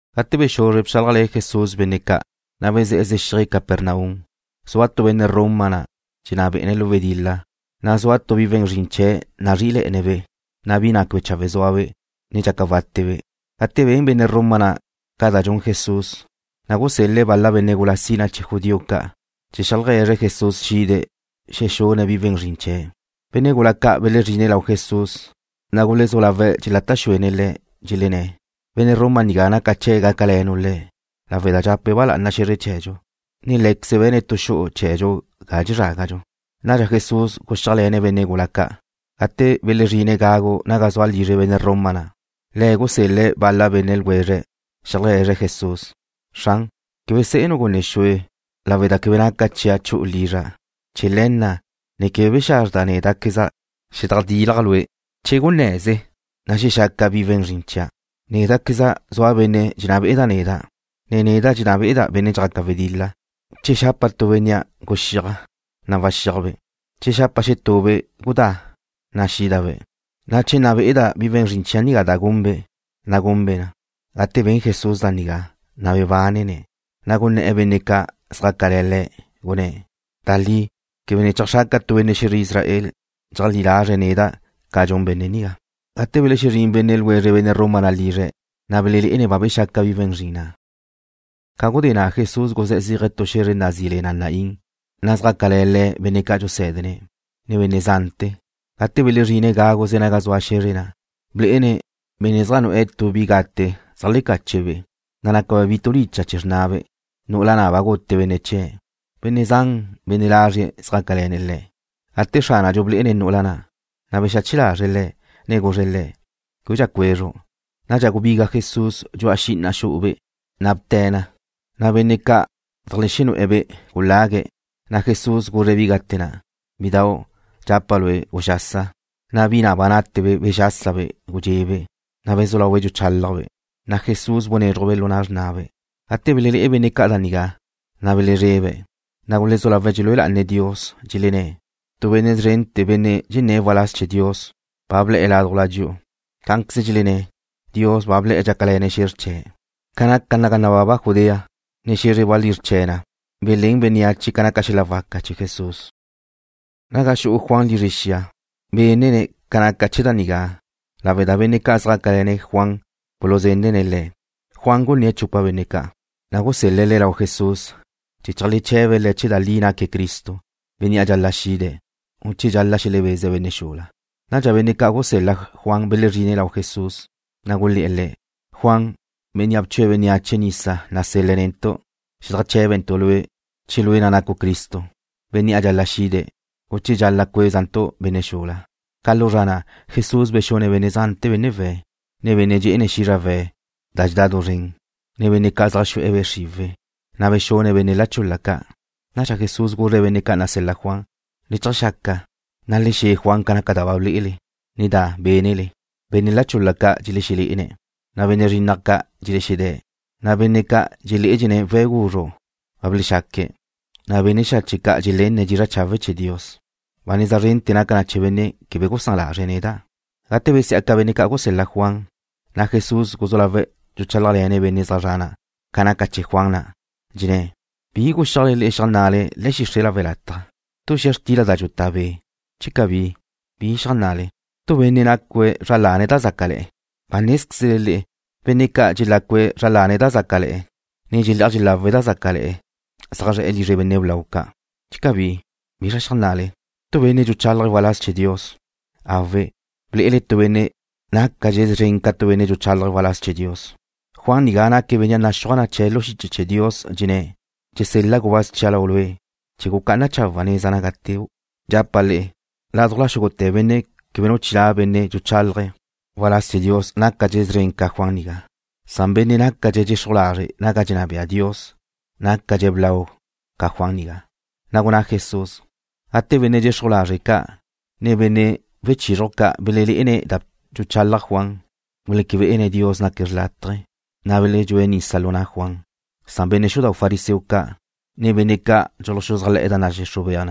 Gate bexuzre bchálajle̱ Jesús benne' ca', na' bezé̱'e̱ zexíaje̱' Capernaum. Zua tu benne' Roma na', benne' dxenná be'e̱ lu wedil-la, na' zua tu bi we̱n zrin chee̱' nazrí'ile̱'e̱ne̱'-be', na' bi na' quebe chawe' zúabe', ne dxaca wátebe'. Gate ben benne' Roma na' ca da dxun Jesús, na' gusél-le̱' bal-la benne' gula sina chee̱ judío ca', chee̱ xeajlegue̱zre̱' Jesús xide̱' xexune̱' bi we̱n zrin chee̱'. Benne' gula ca' belezrine̱' lau Jesús, na' gulezú lawe̱' dxelata' xuene̱' Le̱', dxelenné̱': ―Benne' Roma nigá naca chee̱' gácale̱nu' le̱', lawe' da dxape̱' ba lá'ana xe̱zre chee̱dxu, na' lé̱queze̱' be̱ne̱' tu xu'u chee̱dxu ga dxezrágadxu. Nadxa Jesús guxíajle̱ne̱' benne' gula ca'. Gate belezrine̱' gagu naga zua lizre benne' Roma na', le̱' gusél-le̱' bal-la benne' ljwezre̱' xeajlegue̱zre̱' Jesús: ―Xran, quebe senu' gunne xue, lawe' da quebe naca chia' chu'u lizra'. Chee̱ le̱ na' ne quebe bexazrda' néda'queza' xedajdilja' Lue'. Cun gunnaze, na' xexaca bi we̱n zrin chia'. Néda'queza' zua benne' dxenná bé'ene̱' neda', na' neda' dxenná be'eda' benne' dxjaca wedil-la. Che xapa' tu bénnea': Guxíaj, na' waxíajbe', ne che xapa' xetube': Gudá, na' wídabe', ne che nna be'eda' bi we̱n zrin chia' da gunbe', na' gunbe' na. Gate ben Jesús da nigá, na' bebánene̱', na' gunné̱'e̱ benne' ca' zjácale̱ Le̱', gunné̱': ―Da li, quebe ne cheajxraca' tu benne' xe̱zre Israel dxeajlí lazre̱' neda' ca dxun benne' nigá. Gate belexezrín benne' ljwezre benne' Roma na' lizre̱', na' belelé'ene̱' ba bexaca bi we̱n zrin na'. Ca gudé na' Jesús guzé̱'e̱ zéaje̱' tu xe̱zre da nazí le na Naín, na' xjácale̱ Le̱' benne' ca' dxusé̱dene̱', ne benne' zante̱. Gate bzrine̱' gáguze naga zua xe̱zre na', blé'ene̱' benne' zaj nu'e̱ tu bi gate zeajlecache̱'-be', na' naca be̱' bi tulicha' chee̱ xrnabe', nu'ula na' ba gute benne' chie̱'. Benne' zan, benne' lazrie̱' zjácale̱ne̱' le̱'. Gate Xránadxu blé'ene̱' nu'ula na', na' bexache lazre̱' le̱', ne guzre̱' le̱': ―Québedxa cuezru'. Nadxa gubiga Jesús dxu'a xi'ina xu'ube', na' bte̱' na. Na' benne' ca' zeajlexexu'e̱-be' gulague̱'. Na' Jesús guzre̱' bi gate na': ―Bidau', dxapa' lue', guxasa. Na' bi na' ba nate bexásabe' gudxe'be', na' bezú laube' dxuchálajbe'. Na' Jesús bunézruje̱'-be' lu na' xrnabe'. Gate belelé'e benne' ca' da nigá, na' belezrebe̱', ne gulezú lawe̱' dxelúe lá'ane̱' Dios, dxelenné̱': ―Tu benne' zrente̱, benne' dxenné̱' waláz chee̱ Dios, ba ble̱'e̱ ládujla dxi'u. Cá'anqueze dxelenné̱': ―Dios ba ble̱'e̱ dxácale̱ne̱' xe̱zr chee̱'. Ca naca naga nababa Judea, ne xe̱zre walízr chee̱ na belén bénneache ca naca xel-la waca chee̱ Jesús. Naga xu'u Juan lizre xia, bénene̱' ca naca chee̱ da nigá lawe' da benne' ca' zjácale̱ne̱' Juan buluzenne̱' le̱' da dxaca na. Juan gunné̱' chupa benne' ca', na' gusel-le̱' le̱' lau Jesús chee̱ cheajleche̱be̱' Le̱' che da li naque̱' Cristo, bénnea' dxal-la' xide̱', u che dxal-la' xelebeze̱' benne' xula. Nadxa benne' ca' gusel-la Juan belezrine̱' lau Jesús, na' gulé̱'e̱ Le̱': ―Juan, bénnea' bchue̱' bénneache nisa nasel-le̱' netu' zedajché̱bentu' Lue' che Lue' na' nacu' Cristo, bénnea' dxal-la' xide̱', u che dxal-la' cuézantu' benne' xula. Ca lu zra na' Jesús bexune̱' benne' zante̱ benne' we̱', ne benne' dxé'ene̱' xízrawe̱' da dxedá du zren, ne benne' ca' zaj xu'e̱ be' xriwe̱', na' bexune̱' benne' la chul-la ca'. Nadxa Jesús guzre̱' benne' ca' nasel-la Juan: ―Le cheajxaca, ne le xe̱ Juan ca naca da ba ble'ele, ne da bénele. Benne' la chul-la ca' dxelexelé'ene̱', na' benne' zrinnaj ca' dxelexedé̱', na' benne' dxeledxé'ene̱' we̱' guzru' ba belexaque̱', na' benne' xache' ca' dxelenne̱' dizra' chawe' chee̱ Dios. Ba neza zren naca na chee̱ benne' quebe gusán lazre̱' neda'. Gate besí'aca benne' ca' gusel-la Juan, na' Jesús guzú lawe̱' dxuchálajle̱ne̱' benne' zaj zre̱'e̱ na' ca naca chee̱ Juan na', dxenné̱': ―¿Bizra guxiajle le'e xeajnna'le le̱'e̱ xixre' lawe' lataj? ¿Tu xia xtila da dxutá be'? Che cabí, ¿bizra xeajnna'le? ¿Tu benne' nacu zra lane̱' da zácale̱'e̱? Ba nézquezle le'e benne' ca' dxelacu zra lane̱' da zácale̱'e̱, ne dxelé'aj dxelawe̱' da zácale̱'e̱ zaj zre̱'e̱ lizre benne' blau ca'. Che cabí, ¿bizra xeajnna'le? ¿Tu benne' dxuchálaje̱' waláz chee̱ Dios? Awe', ble'ele tu benne' nácadxe̱' szren ca tu benne' dxuchálajé̱' waláz chee̱ Dios. Juan nigá naque̱' bénnea' naxúaj na chee̱' lu xiche chee̱ Dios, dxenné̱': Dxesel-la' gubáz chia' lau Lue', chee̱ gucá'ana chawe̱' neza naga teu'. Dxapa' le'e, ládujla xúgute̱ benne' quebe nu chilá' benne' dxuchálaje̱' waláz chee̱ Dios nácadxe̱' szren ca Juan nigá. Na'a benne' nácadxe̱' dxexruj lazre' naga dxenná bea Dios nácadxe̱' blau ca Juan nigá. Na' gunná Jesús: ―Gate na' benne' dxexruj lazre' ca', ne benne' wechizruj ca' belenne̱' da dxuchalaj Juan, guleque bé'ene̱' Dios naque̱' xrlátaje, na' beledxúe̱' nisa lu na' Juan. Benne' xudau' fariseo ca', ne benne' ca' dxuluxuzájle̱'e̱ da nadxixruj bea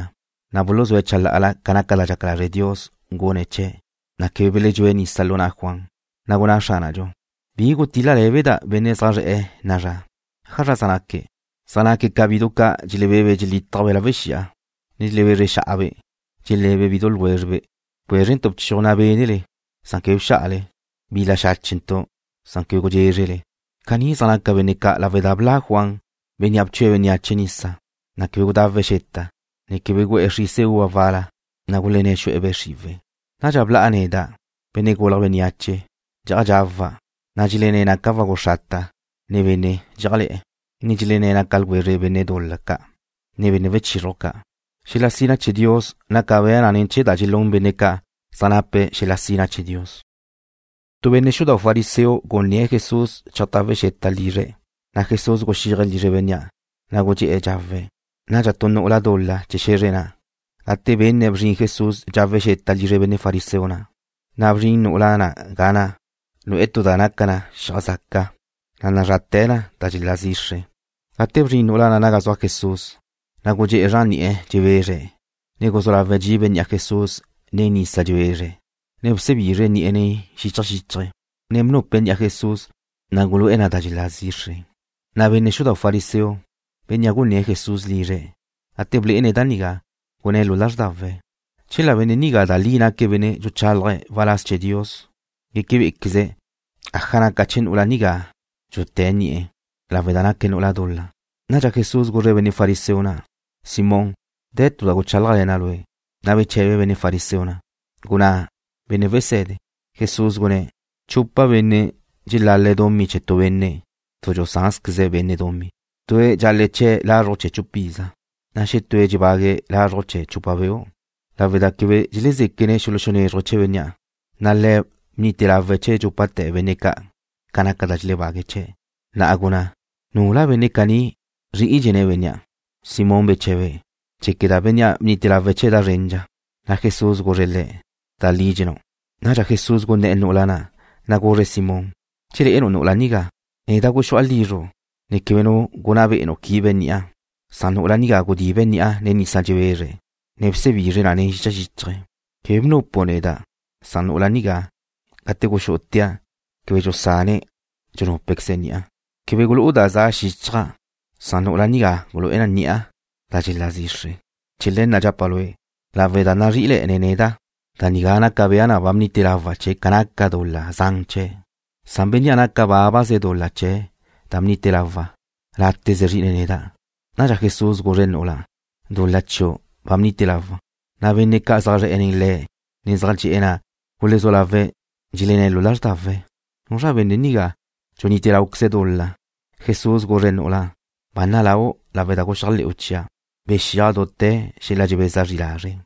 na buluzúe̱' chalá'ala ca naca da dxaca lazre' Dios gune̱' chee̱', na' quebe beledxúe̱' nisa lu na' Juan. Na' gunná Xránadxu: ―¿Ájazra gutil-la lé̱beda' benne' zaj zre̱'e̱ na'a zra? ¿ájazra zaj naque̱'? Zaj naque̱' ca bidu ca' dxelebe'be' dxelítajbe' lawe' xi'a, ne dxelebezre xa'abe', dxele̱be' bidu ljwézrebe': “Bcuézrentu' bchiuj da bénele, san quebe bxá'ale. Bil-la xáchentu', san quebe gudxézrele.” Caní zaj naca benne' ca' lawe' da bla' Juan, bénnea' bchue̱' bénneache nisa, ne quebe gudawe̱' xeta, ne quebe gu'e̱ xrise uva wal-la, na' gulenné̱' xu'e̱ be' xriwe̱'. Nadxa bla'a neda', Benne' Gulje̱' Bénneache, dxe'aj dxawa', na' dxelenné̱' naca' wagu xrata, ne benne' dxé'ajle̱'e̱, ne dxelenné̱' naca' ljwezre benne' dul-la ca', ne benne' wechizruj ca'. Xel-la sina chee̱ Dios naca bea na ne̱ chee̱ da dxelún benne' ca' zaj nape̱' xel-la sina chee̱ Dios. Tu benne' xudau' fariseo gunné̱' Jesús cheajtawe̱' xeta lizre̱', na' Jesús guxíaje̱' lizre bénnea', na' gudxé'e̱ dxawe̱'. Nadxa tu nu'ula dul-la chee̱ xe̱zre na', gate benne̱' bzrin Jesús dxawe̱' xeta lizre benne' fariseo na', na' bzrin nu'ula na' ga na', nu'e̱ tu da' naca na xiaj zaca, da nazráte̱ na da dxelá zixre. Gate bzrin nu'ula na' naga zua Jesús, na' gudxé'e̱ zran ni'e̱ dxebezre̱', ne guzú lawe̱' dxibe̱' ni'a Jesús nen nisa dxebezre̱', ne bsebizre̱' ni'e̱ nen xicha xíchaje̱', ne bnupe̱' ni'a Jesús, na' gulu'e̱ na da dxelá zixre na'. Na' benne' xudau' fariseo, bénnea' gunné̱' Jesús lizre̱', gate blé'ene̱' da nigá, gunné̱' lu lázrdawe̱': “Chela benne' nigá da li naque̱' benne' dxuchálaje̱' waláz chee̱ Dios, guéquebe'equeze̱' aja naca chee̱ nu'ula nigá dxuté̱' ni'e̱, lawe' da naque̱' nu'ula dul-la.” Nadxa Jesús guzre̱' benne' fariseo na': ―Simón, de̱ tu da guchálajle̱na' lue'. Na' beche̱be benne' fariseo na': ―Gunná, Benne' Wese̱de. Jesús gunné̱': ―Chupa benne' dxelal-le̱' dumí chee̱ tu benne' tu dxusánte̱zqueze̱' benne' dumí. Tue̱' dxal-le̱' chee̱' lazruj chee̱ chupiza, na' xetúe̱' dxebague̱' lazruj chee̱ chupa beu'. Lawe' da quebe dxelezéquene̱' xelexexízruje̱' chee̱ bénnea', na' le̱' bnite lawe̱' chee̱ dxúpate̱ benne' ca' ca naca da dxelebague̱' chee̱'. Na'a gunná, ¿nula benne' caní zrí'idxene̱' bénnea'? Simón beche̱be̱': ―Dxéqueda' bénnea' bnite lawe̱' chee̱' da zrendxa. Na' Jesús guzre̱' le̱': ―Da li dxennáu'. Nadxa Jesús gunné̱'e̱ nu'ula na', na' guzre̱' Simón: ―¿Dxelé'enu' nu'ula nigá? Neda' guxu'a lizru', ne quebe nu gunná be'enu' quibe ni'a, san nu'ula nigá gudibe̱' ni'a nen nisa dxebezre̱', ne bsebizre̱' na nen xicha xíchaje̱'. Quebe bnupu' neda', san nu'ula nigá, gate guxú'utea', quebe dxusane̱' dxunúpequeze̱' ni'a. Quebe gulú'u da za xíchaja', san nu'ula nigá gulu'e̱ ni'a da dxelále̱'e̱ zixre. Chee̱ le̱ na' dxapa' lue', lawe' da nazrí'ile̱'e̱ne̱' neda', da nigá naca bea na ba bnite lawa' chee̱' ca naca dul-la zan chee̱', san bénnea' naca bábaze dul-la chee̱' da bnite lawa', láteze zrí'ine̱' neda'. Nadxa Jesús guzre̱' nu'ula': ―Dul-la chiu' ba bnite lawa'. Na' benne' ca' zaj zre̱'e nen Le̱', ne zaj dxe'e̱ na' gulezú lawe̱' dxelenné̱' lu lázrdawe̱': “¿Nuzra benne' nigá, dxunite láuqueze̱' dul-la?” Jesús guzre̱' nu'ula na': ―Ba naláu' lawe' da guxéajle̱'u chia'. Bexíaj dute̱ xel-la dxebeza zri lazre'.